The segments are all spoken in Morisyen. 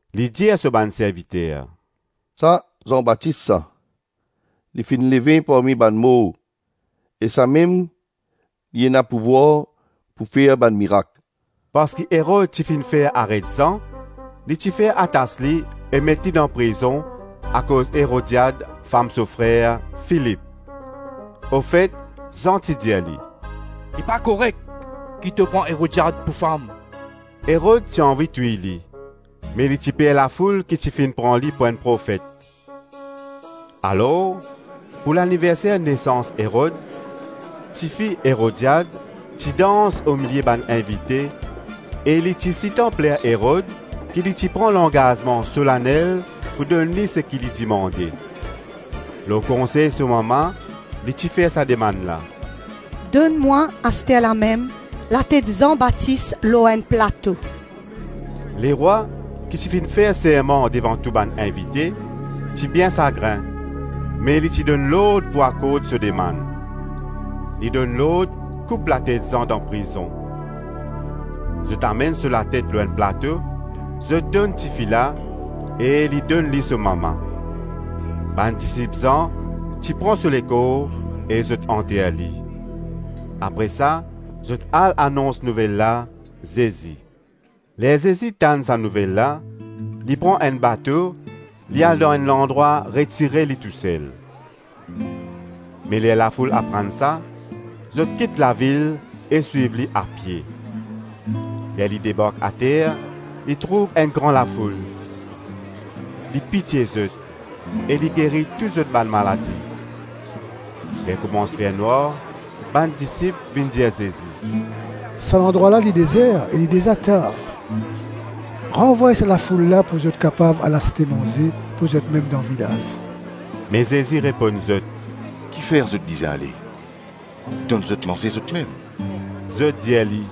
Li dir so bann serviter, “Sa Zan Batis sa; li finn leve parmi bann mor e samem li ena pouvwar pou fer bann mirak.” Parski Erod ti finn fer aret Zan, li ti fer atas li e met li dan prizon akoz Erodiad fam so frer, Filip. Ofet, Zan ti dir li, “Li pa korek ki to pran Erodiad pou fam.” Erod ti anvi touy li, me li ti per lafoul ki ti finn pran li pou enn profet. Alor, pou laniverser nesans Erod, tifi Erodiad ti dans omilie bann invite e li ti sitan pler Erod ki li ti pran langazman solanel pou donn li seki li dimande. Lor konsey so mama, li ti fer sa demann la: “Donn mwa, asterlamem latet Zan Batis lor enn plato.” Lerwa, ki ti finn fer serman devan tou bann invite, ti bien sagrin me li ti donn lord pou akord so demann. Li donn lord koup latet Zan dan prizon. Zot amenn so latet lor enn plato, zot donn tifi la e li donn li so mama. Bann disip Zan ti pran so lekor e zot anter li. Apre sa zot al anons nouvel la Zezi. Ler Zezi tann sa nouvel la, li pran enn bato, li al dan enn landrwa retire li tousel. Me ler lafoul aprann sa, zot kit lavil e swiv li apie. Ler li debark ater, li trouv enn gran lafoul; li pitie zot e li geri tou zot bann maladi. Ler koumans fer nwar, bann disip vinn dir Zezi, “Sa landrwa la li dezer e li deza tar, ranvway sa lafoul la pou zot kapav al aste manze pou zotmem dan vilaz.” Me Zezi reponn zot, “Kifer zot bizin ale? Donn zot manze zotmem.” Zot dir li,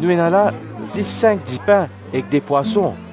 “Nou ena la zis sink dipin ek de pwason.”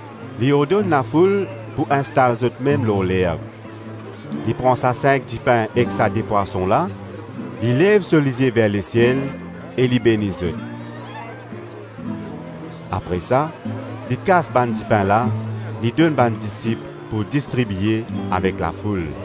Li ordonn lafoul pou instal zotmem lor lerb, li pran sa sink dipin ek sa de pwason la, li lev so lizie ver lesiel e li beni zot. Apre sa li kas bann dipin la, li donn bann disip pou distribie avek lafoul.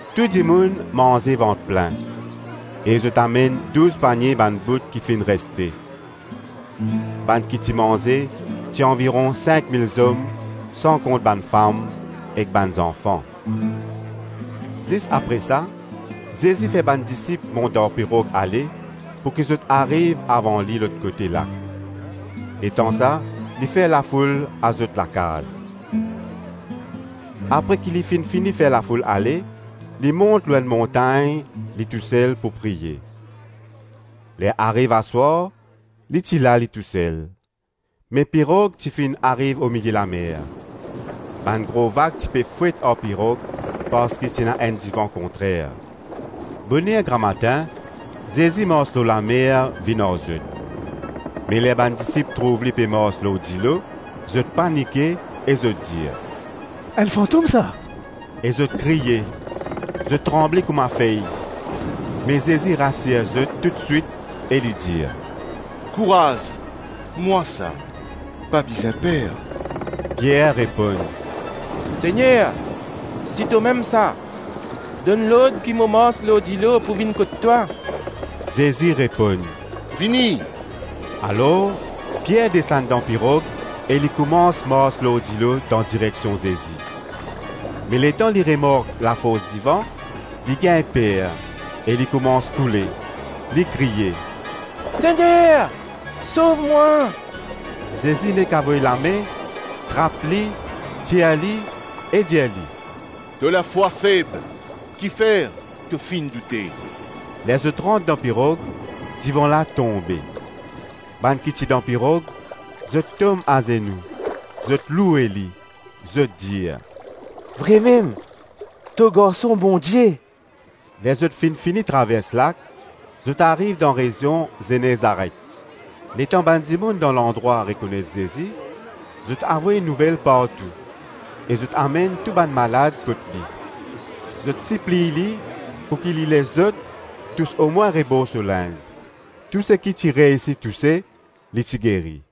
Tou dimoun manze vant plin e zot amenn douz panie bann bout ki finn reste. Bann ki ti manze ti anviron sink mil zom san kont bann fam ek bann zanfan. Zis apre sa, Zezi fer bann disip mont dan pirog ale pouki zot ariv avan li lot kote lak, letan sa li fer lafoul al zot lakaz. Apre ki li finn fini fer lafoul ale, li mont lor enn montagn li tousel pou priye. Ler ariv aswar, li ti la li tousel, me pirog ti finn ariv omilie lamer. Bann gro vag ti pe fwet ar pirog parski ti ena enn divan kontrer. Boner gramatin, Zezi mars lor lamer vinn ar zot. Me ler bann disip trouv li pe mars lor dilo, zot panike e zot dir, “Enn fantom sa!” E zot kriye, zot tranble kouma fey. Me Zezi rasir zot toutswit e li dir, “Kouraz, mwa sa; pa bizin per.” Pier reponn, “Segner, si tomem sa, donn lord ki mo mars lor dilo pou vinn kot twa.” Zezi reponn, “Vini.” Alor Pier desann dan pirog e li koumans mars lor dilo dan direksion Zezi. Me letan li remark lafors divan, li gagn per e li koumans koule; li kriye “Segner, sov mwa!” Zezi nek avoy lame, trap li, tir li e dir li, “To lafwa feb, kifer to finn doute?” Ler zot rant dan pirog, divan la tonbe. Bann ki ti dan pirog, zot tom azenou, zot loue li, zot dir, “Vremem to Garson Bondie.” Ler zot finn fini travers lak, zot ariv dan rezion Zenezaret. Letan bann dimoun dan landrwa rekonet Zezi, zot avoy nouvel partou e zot amenn tou bann malad kot li. Zot sipliy li pouki li les zot tous omwin rebor so linz. Tou seki ti reysi touse, li ti geri.